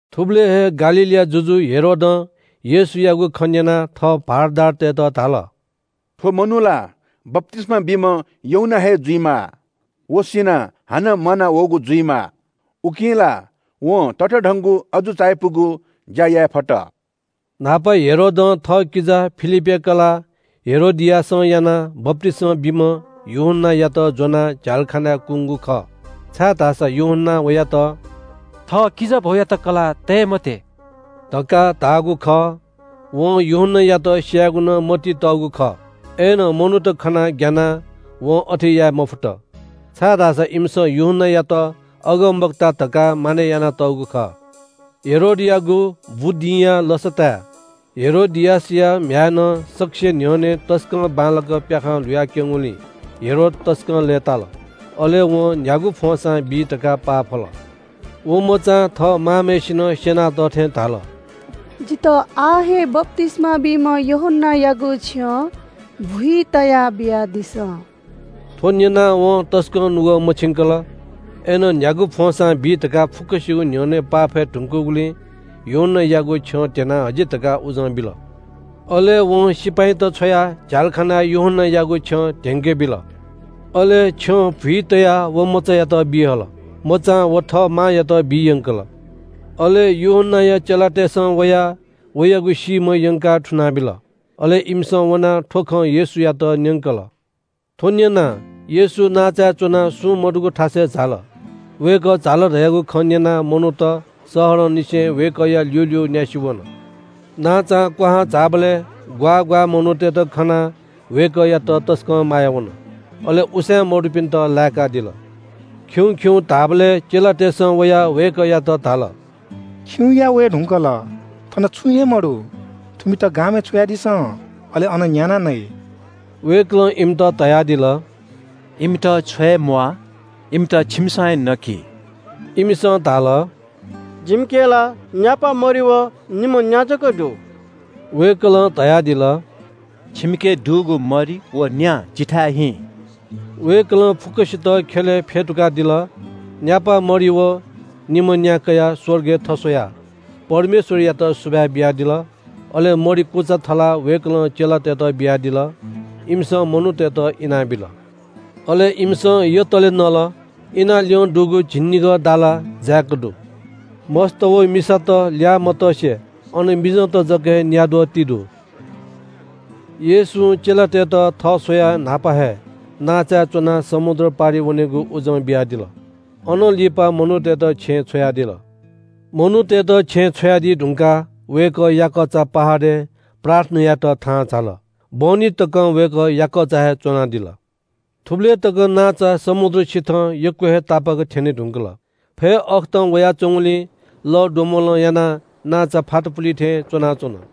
थुबलय् हे गालीलया जुजु हेरोदं येशूयागु खँ न्‍यनाः थः भारदारतय्‌त धाल – “थ्‍व मनू ला बप्‍तिस्‍मा बीम्‍ह यूहन्‍ना हे जुइमाः। व सिनाः हानं म्‍वानावःगु जुइमाः, उकिं ला वं ततःधंगु अजू चायापुगु ज्‍या याये फत।” न्‍हापा हेरोदं थःकिजा फिलिपया कलाः हेरोदियासं यानाः बप्‍तिस्‍मा बीम्‍ह यूहन्‍नायात ज्‍वनाः झ्‍यालखानाय् कुंगु खः। छाय्‌धाःसा यूहन्‍नां वयात “थः किजाभौयात कलाः तये मत्‍यः” धकाः धाःगु खः। वं यूहन्‍नायात स्‍यायेगु नं मतिइ तःगु खः। अय्‌नं मनूत खनाः ग्‍यानाः वं अथे याये मफुत, छाय्‌धाःसा इमिसं यूहन्‍नायात अगमवक्ता धकाः मानय् यानातःगु खः। हेरोदयागु बुदिंया लसताय् हेरोदियासया म्‍ह्याय्‌नं सकसिया न्‍ह्यःने तसकं बांलाक प्‍याखं ल्‍हुयाक्‍यंगुलिं हेरोद तसकं लय्‌ताल। अले वं न्‍ह्यागु फ्‍वंसां बी धकाः पाफल। व मचां थः मांम्‍हय्‌सिनं स्‍यनातःथें धाल – “जितः आः हे बप्‍तिस्‍मा बीम्‍ह यूहन्‍नायागु छ्यं भुइ तयाः बियादिसँ।” थ्‍व न्‍यनाः वं तसकं नुगः मछिंकल, अय्‌नं न्‍ह्यागु फ्‍वंसां बी धकाः फुक्‍कसिगु न्‍ह्यःने पाफये धुंकूगुलिं यूहन्‍नायागु छ्यं ध्‍यनाः हजि धकाः उजं बिल। अले वं सिपाइँत छ्वयाः झ्‍यालखानाय् यूहन्‍नायागु छ्यं धेंके बिल। अले छ्यं भुइ तयाः व मचायात बी हल। मचां व थः मांयात बी यंकल। अले यूहन्‍नाया चेलातय्‌सं वयाः वयागु सीम्‍ह यंकाः थुनाबिल। अले इमिसं वनाः थ्‍व खँ येशूयात न्‍यंकल। थ्‍व न्‍यनाः येशू नांचाय् च्‍वनाः सुं मदुगु थासय् झाल। वय्‌कः झाल धयागु खँ न्‍यनाः मनूत शहरंनिसें वय्‌कःया ल्‍यूल्‍यू न्‍यासि वन। नांचां क्‍वहां झाःबलय् ग्‍वाः ग्‍वाः मनूतय्‌त खनाः वय्‌कःयात तसकं माया वन, अले उसाँय् मदुपिन्‍त लाय्‌कादिल। खिउँ खिउँ धाःबलय् चेलातय्‌सं वयाः वय्‌कःयात धाल – “खिउँया वये धुंकल, थन छुं हे मदु। थुमित गामय् छ्वयादिसँ। अले अन न्‍यानाः नइ।” वय्‌कलं इमित धयादिल – “इमित छ्वये म्‍वाः, इमित छिमिसं हे नकि।” इमिसं धाल – “जिमिके ला न्‍यापा मरि व निम्‍ह न्‍या जक दु।” वय्‌कलं धयादिल – “छिमिके दुगु मरि व न्‍या जिथाय् हिँ।” वय्‌कलं फुक्‍कसित ख्‍यलय् फ्‍यतुकादिल। न्‍यापा मरि व निम्‍ह न्‍या कयाः स्‍वर्गय् थस्‍वयाः परमेश्‍वरयात सुभाय् बियादिल। अले मरि कुचा थलाः वय्‌कलं चेलातय्‌त बियादिल। इमिसं मनूतय्‌त इनाबिल। अले इमिसं यतले नल। इनाः ल्‍यं दुगु झिंनिगः दाला जाय्‌क दु। मस्‍त व मिसात ल्‍याः मतसे अन मिजंत जक हे न्‍याद्वः ति दु। येशूं चेलातय्‌त थः स्‍वयाः न्‍हापा हे नांचाय् च्‍वनाः समुद्र पारि वनेगु उजं बियादिल। अनं लिपा मनूतय्‌त छेँय् छ्वयादिल। मनूतय्‌त छेँय् छ्वयादी धुंकाः वय्‌कः याकःचा पहाडय् प्रार्थना यायेत थाहां झाल। बहनी तकं वय्‌कः याकःचा हे च्‍वनादिल। थुबलय् तक नांचा समुद्र सिथं यक्‍व हे तापाक्‍क थ्‍यने धुंकल। फय् अःखतं वयाच्‍वंगुलिं लःद्वम्‍बलं यानाः नांचा फातापुली थें च्‍वनाच्‍वन।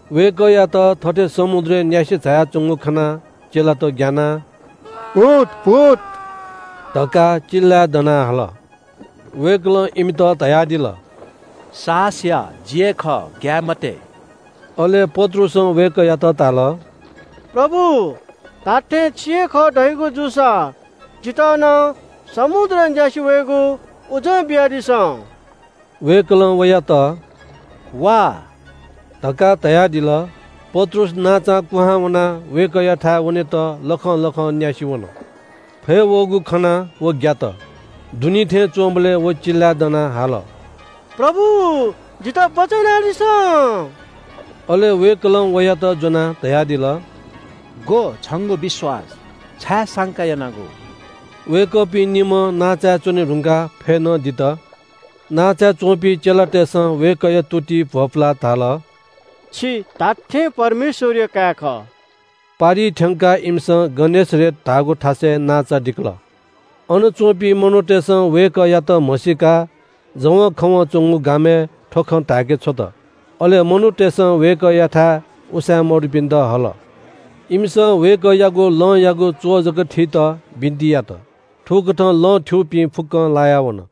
वय्‌कःयात थथे समुद्रय् न्‍यासि झायाच्‍वंगु खनाः चेलात ग्‍यानाः “भूत भूत” धकाः चिल्‍लाय् दनाः हाल। वय्‌कलं इमित धयादिल – “साहस या, जि हे खः, ग्‍याये मते।” अले पत्रुसं वय्‌कःयात धाल – “प्रभु, धात्‍थें छि हे खः धयागु जूसा जितः नं समुद्रय् न्‍यासि वयेगु उजं बियादिसँ।” वय्‌कलं वयात “वा” धकाः धयादिल। पत्रुस नांचां कुहां वनाः वय्‌कःयाथाय् वनेत लखं लखं न्‍यासि वन। फय् वःगु खनाः व ग्‍यात, दुनी थें च्‍वंबलय् व चिल्‍लाय् दनाः हाल – “प्रभु, जितः बचय् यानादिसँ।” अले वय्‌कलं वयात ज्‍वनाः धयादिल – “ग्‍व, छंगु विश्‍वास, छाय् संका यानागु?” वय्‌कःपिं निम्‍हं नांचाय् च्‍वने धुंकाः फय् नं दित। नांचाय् च्‍वंपिं चेलातय्‌सं वय्‌कःया तुतिइ भ्‍वपुलाः धाल – “छि धात्‍थें परमेश्‍वरया काय् खः।” पारिइ थ्‍यंकाः इमिसं गनेसरेत धाःगु थासय् नांचा दिकल। अन च्‍वंपिं मनूतय्‌सं वय्‌कःयात म्‍हसीकाः जवंखवं च्‍वंगु गामय् थ्‍व खँ धाय्‌के छ्वत। अले मनूतय्‌सं वय्‌कःयाथाय् उसाँय् मदुपिन्‍त हल। इमिसं वय्‌कःयागु लंयागु च्‍वः जक थीत बिन्‍ति यात। थुकथं लं थ्‍यूपिं फुक्‍कं लाया वन।